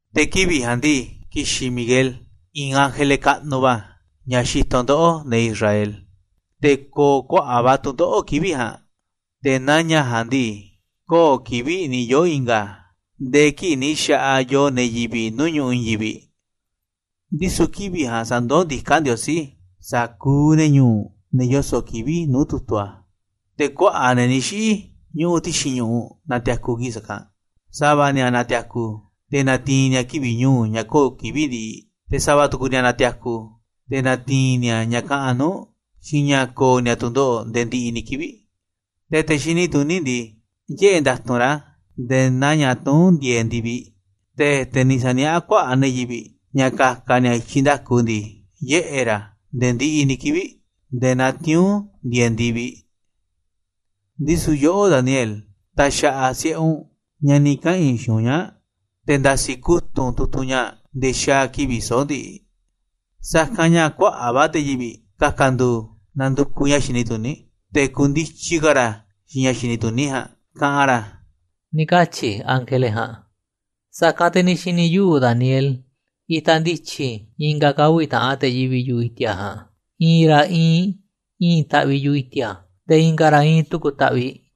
‘Te̱ kivi̱ꞌ ja̱a̱nꞌ ndii, ki̱xi̱n Miguel, i̱i̱n ángele kaꞌnuꞌ va̱, ña̱ xitoꞌ ndoꞌó, ne̱ Israel. Te̱ ko̱o̱ kuaꞌa̱ꞌ va̱ tu̱ndoꞌo̱ꞌ kivi̱ꞌ ja̱a̱nꞌ, te̱ naa ña̱ ja̱a̱nꞌ ndii, kö̱o̱ kivi̱ꞌ ni̱ yoo̱ i̱nga̱ a̱ nde̱e̱ kii̱ꞌ ni̱ xa̱ꞌaꞌ yoo ne̱ yivi̱ꞌ nuu̱ꞌ ñu̱ꞌuꞌ i̱i̱n yivi̱ꞌ, ndisu̱ kivi̱ꞌ ja̱a̱nꞌ sa̱ndoó ndiká Ndiosí sa̱kuuꞌ ne̱ ñu̱u̱ u̱nꞌ, ne̱ yoso̱ꞌ kivi̱ꞌ nuu̱ꞌ tu̱tu̱ a̱. Te̱ kuaꞌa̱ꞌ ne̱ ni̱ xiꞌi̱ ñuꞌuꞌ ti̱xi̱n ñu̱ꞌuꞌ na̱ti̱a̱ku̱ kii̱ꞌ sa̱kanꞌ, sa̱va̱ ni̱a̱ na̱ti̱a̱ku̱ te̱ na̱ti̱i̱n ni̱a̱ kivi̱ꞌ ñu̱u̱ ña̱ kö̱o̱ kivi̱ꞌ ndiꞌiꞌ, te̱ sa̱va̱ tu̱ku̱ ni̱a̱ na̱ti̱a̱ku̱ te̱ na̱ti̱i̱n ni̱a̱ ña̱ kaꞌanꞌ nuu̱ꞌ, xiinꞌ ña̱ ko̱o̱ ni̱a̱ tu̱ndoꞌo̱ꞌ nde̱e̱ ndiꞌiꞌ ni̱ kivi̱ꞌ. Te̱ te̱ xini tuní ndii, yiꞌe̱ nda̱tu̱nꞌ ra̱ nde̱e̱ naa ña̱ tuún ndieeꞌ ndi̱viꞌ. Te̱ te̱ ni̱ sa̱niaꞌá kuaꞌa̱ꞌ ne̱ yivi̱ꞌ ña̱ ka̱ka̱ ni̱a̱ i̱tyiꞌ nda̱ku ndii, yiꞌe̱ ra̱ nde̱e̱ ndiꞌiꞌ ni̱ kivi̱ꞌ nde̱e̱ naa tiuu̱nꞌ ndieeꞌ ndi̱viꞌ. ‘Ndisu̱ yoꞌó, Daniel, ta̱xa̱ꞌa̱ si̱ꞌe u̱nꞌ ña̱ ni̱ kaꞌa̱n i̱ xiinꞌ u̱nꞌ ñaa̱ꞌ, te̱ nda̱si̱ kutu̱ꞌ u̱nꞌ tu̱tu̱ ñaa̱ꞌ nde̱e̱ xaa̱ kivi̱ꞌ soꞌo̱ꞌ ndiꞌiꞌ. Sa̱kanꞌ ña̱ kuaꞌa̱ꞌ va̱ te̱ yivi̱ꞌ ka̱ka̱ ndu̱u̱ na̱ndu̱kuꞌ ña̱ xini tuní, te̱ ku̱ndityi ka̱ ra̱ xiinꞌ ña̱ xini tuní ja̱a̱nꞌ kaꞌanꞌ ra̱,’ ni̱ katyi̱ ángele ja̱a̱nꞌ. “Sa̱kanꞌ te̱ ni̱ xi̱ni̱ yuꞌu̱, Daniel, itaꞌ ndityi i̱nga̱ ka̱ uvi̱ taꞌan te̱ yivi̱ꞌ yu̱ꞌuꞌ i̱ti̱a̱ ja̱a̱nꞌ, i̱i̱n ra̱ iinꞌ i̱i̱n taꞌviꞌ yu̱ꞌuꞌ i̱ti̱a̱, te̱ i̱nga̱ ra̱ iinꞌ tu̱ku̱ taꞌviꞌ.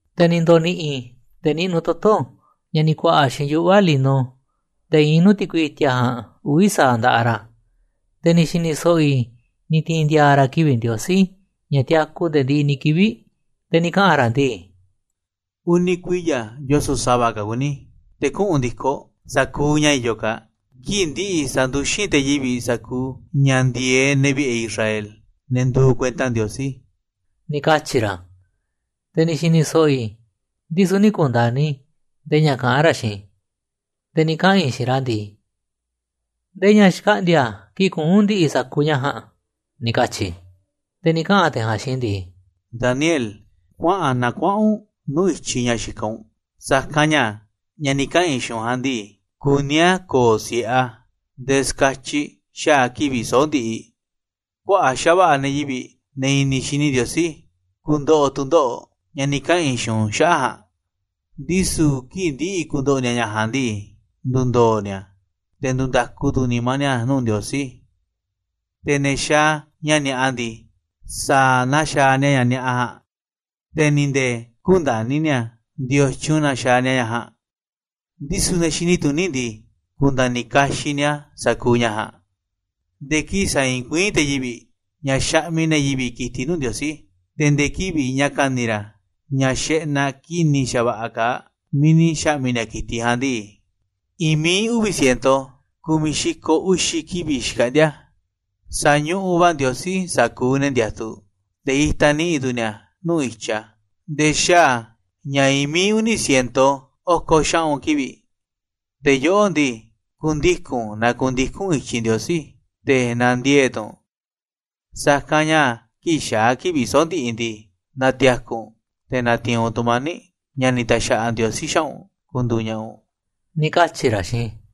“Te̱ ni̱ ndo̱ni̱ꞌi̱ te̱ niꞌnuꞌ toto̱, ña̱ ni̱ ku̱a̱ꞌa̱ xiinꞌ yuꞌva̱ lino, te̱ iinꞌ nuu̱ꞌ ti̱kui i̱ti̱a̱ ja̱a̱nꞌ, uvi̱ sa̱aꞌ nda̱ꞌaꞌ ra̱, te̱ ni̱ xi̱ni̱ so̱ꞌo̱ i̱ ni̱ ti̱i̱n ndi̱a̱a̱ ra̱ kivi̱ꞌ Ndiosí, ña̱ tiaku nde̱e̱ ndiꞌiꞌ ni̱ kivi̱ꞌ, te̱ ni̱ kaꞌa̱n ra̱ ndii: ‘Uni̱ kuiya̱ yoso̱ꞌ sa̱va̱ ka̱ kuní te̱ kuꞌu̱n ndi̱koꞌ sa̱kuuꞌ ña̱ i̱yo̱ kaa̱ꞌ. Kii̱ꞌ ndi̱ꞌi̱ sa̱nduxín te̱ yivi̱ꞌ sa̱kuuꞌ ña̱ ndi̱e̱eꞌ ne̱ vi̱ꞌe̱ Israel, ne̱ nduuꞌ kuenta Ndiosí,’ ni̱ katyi̱ ra̱. “Te̱ ni̱ xi̱ni̱ so̱ꞌo̱ i̱, ndisu̱ nï̱ ku̱nda̱ni̱ i̱ ndee ña̱ kaꞌán ra̱ xiinꞌ i̱, te̱ ni̱ kaꞌa̱n i̱ xiinꞌ ra̱ ndii: ¿Ndee ña̱ xkaꞌndi̱a̱ kii̱ꞌ kuꞌu̱n ndi̱ꞌi̱ sa̱kuuꞌ ña̱ ja̱a̱nꞌ?, ni̱ katyi̱ i̱. “Te̱ ni̱ kaꞌa̱n te̱ ja̱a̱nꞌ xiinꞌ i̱ ndii: ‘Daniel, kuaꞌa̱n na kuaꞌa̱n u̱nꞌ nuu̱ꞌ i̱tyiꞌ ña̱ xikaꞌ u̱nꞌ, sa̱kanꞌ ña̱, ña̱ ni̱ kaꞌa̱n i̱ xiinꞌ u̱nꞌ ja̱a̱nꞌ ndii, kuní a̱ ko̱o̱ si̱ꞌe a̱ nde̱e̱ ska̱tyiꞌ xaa̱ kivi̱ꞌ soꞌo̱ꞌ ndiꞌiꞌ. Kuaꞌa̱ꞌ xa̱va̱ꞌa̱ ne̱ yivi̱ꞌ, ne̱ i̱ni̱ xini Ndiosí, ku̱ndo̱ꞌo̱ tu̱ndoꞌo̱ꞌ, ña̱ ni̱ kaꞌa̱n i̱ xiinꞌ u̱nꞌ xaꞌa̱ꞌ ja̱a̱nꞌ, ndisu̱ kii̱ꞌ ndi̱ꞌi̱ ku̱ndo̱ꞌo̱ ni̱a̱ ña̱ ja̱a̱nꞌ ndii, ndu̱ndo̱o̱ ni̱a̱, te̱ ndu̱nda̱ku tu̱ nimá ni̱a̱ nuu̱ꞌ Ndiosí. Te̱ ne̱ xaaꞌ ña̱ ni̱a̱ꞌa ndii, sa̱a̱ na xaaꞌ ni̱a̱ ña̱ ni̱a̱ꞌa ja̱a̱nꞌ, te̱ ni̱ nde̱e̱ kü̱nda̱ni̱ ni̱a̱ ndiotyun na xaaꞌ ni̱a̱ ña̱ ja̱a̱nꞌ, ndisu̱ ne̱ xini tuní ndii, ku̱nda̱ni̱ kaxiꞌ ni̱a̱ sa̱kuuꞌ ña̱ ja̱a̱nꞌ. Nde̱e̱ kii̱ꞌ sa̱i̱i̱n kuiín te̱ yivi̱ꞌ ña̱ xaꞌmiꞌ ne̱ yivi̱ꞌ ki̱tiꞌ nuu̱ꞌ Ndiosí, te̱ nde̱e̱ kivi̱ꞌ ña̱ ka̱ni̱ ra̱ ña̱ xeꞌnaꞌ ki̱ni̱ xa̱va̱ꞌa̱ kaaꞌ miiꞌ ni̱ xa̱ꞌmi̱ ni̱a̱ ki̱tiꞌ ja̱a̱nꞌ ndii, i̱i̱n mií uvi̱ ciento ku̱miꞌ xi̱ko̱ uxi̱ kivi̱ꞌ xkaꞌndi̱a̱. Sa̱ñuꞌun va̱ Ndiosí sa̱kuuꞌ ne̱ ndiatuꞌ, te̱ itaꞌ ni̱ꞌi̱ tu̱ ni̱a̱ nuu̱ꞌ i̱tyiꞌ a̱ nde̱e̱ xaa̱ ña̱ i̱i̱n mií uni̱ ciento oko̱ xaꞌu̱n kivi̱ꞌ. Te̱ yoꞌó ndii, ku̱ndiku̱n na ku̱ndiku̱n u̱nꞌ i̱tyiꞌ Ndiosí, te̱ na̱ndiee̱ꞌ tu̱ u̱nꞌ, sa̱kanꞌ ña̱ kii̱ꞌ xaa̱ kivi̱ꞌ soꞌo̱ꞌ ndiꞌiꞌ ndii, na̱ti̱a̱ku̱ u̱nꞌ te̱ na̱ti̱i̱n u̱nꞌ tu̱mani̱ꞌ, ña̱ ni̱ ta̱xa̱ꞌa̱ Ndiosí xaꞌa̱ꞌ u̱nꞌ ku̱ndu̱u̱ ña̱ꞌa̱ u̱nꞌ,’ ni̱ katyi̱ ra̱ xiinꞌ i̱.”